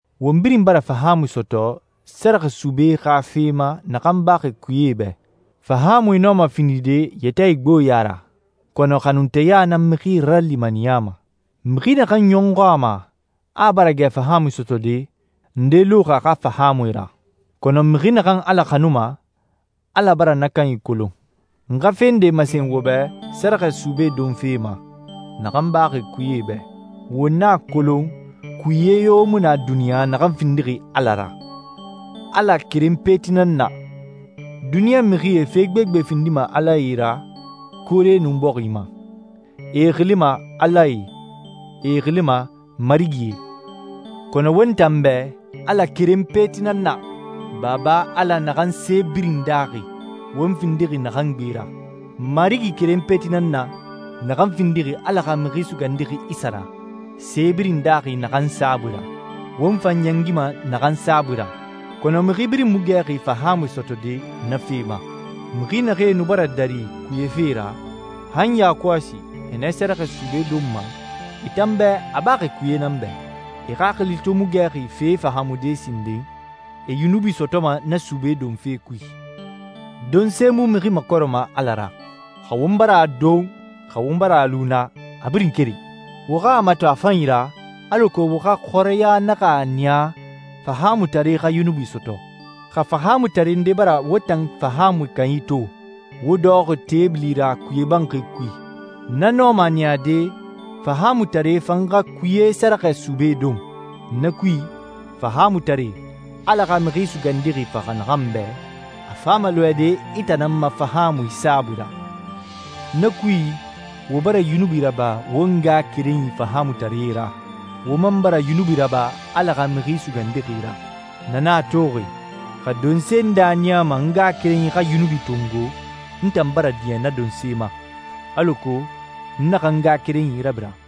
Won birin bara fahaamui sɔtɔ sɛrɛxɛ sube xa fe ma naxan baxi kuyee bɛ. Fahaamui nɔma findide yɛtɛ igboɲa ra, kɔnɔ xanunteya nan mixie ralimaniyama. Mixi naxan ɲɔxɔ a ma a bara gɛ fahaamui sɔtɔde, nde luxi a xa fahaamui ra. Kɔnɔ mixi naxan Ala xanuma, Ala bara na kanyi kolon. N xa fe nde masen wo bɛ sɛrɛxɛ sube donfe ma naxan baxi kuyee bɛ. Won a kolon kuye yo mu na duniɲa naxan findixi Ala ra. Ala keren peti nan na. Duniɲa mixie fe gbegbe findima alae ra koore nun bɔxi ma. E e xilima «alae,» e e xilima «marigie.» Kɔnɔ won tan bɛ Ala keren peti nan na, Baba Ala naxan se birin daaxi, won findixi naxan gbe ra. Marigi keren peti nan na, naxan findixi Ala xa Mixi Sugandixi Isa ra, se birin daaxi naxan saabui ra, won fan ɲɛngima naxan saabui ra. Kɔnɔ mixi birin mu gɛxi fahaamui sɔtɔde na fe ma. Mixi naxee nu bara dari kuye fee ra, han yakɔsi e nɛ sɛrɛxɛ sube donma, e tan bɛ a baxi kuye nan bɛ. E xaxili to mu gɛxi fee fahaamude sinden, e yunubi sɔtɔma na sube donfe kui. Donse mu mixi makɔrɛma Ala ra. Xa won bara a don, xa won bara a lu na, a birin keren. Wo xa a mato a fanyi ra, alako wo xa xɔrɛya naxa a niya fahaamutare xa yunubi sɔtɔ. Xa fahaamutare nde bara wo tan fahaamui kanyi to, wo dɔxɔxi teebili ra kuyee banxi kui, na nɔma a niyade fahaamutare fan xa kuye sɛrɛxɛ sube don. Na kui, fahaamutare, Ala xa Mixi Sugandixi faxa naxan bɛ, a fama lɔɛde i tan nan ma fahaamui saabui ra. Na kui, wo bara yunubi raba wo ngaxakerenyi fahaamutaree ra, wo man bara yunubi raba Ala xa Mixi Sugandixi ra. Na nan a toxi, xa donse nde a niyama n ngaxakerenyi xa yunubi tongo, n tan bara diɲɛ na donse ma, alako n naxa n ngaxakerenyi rabira.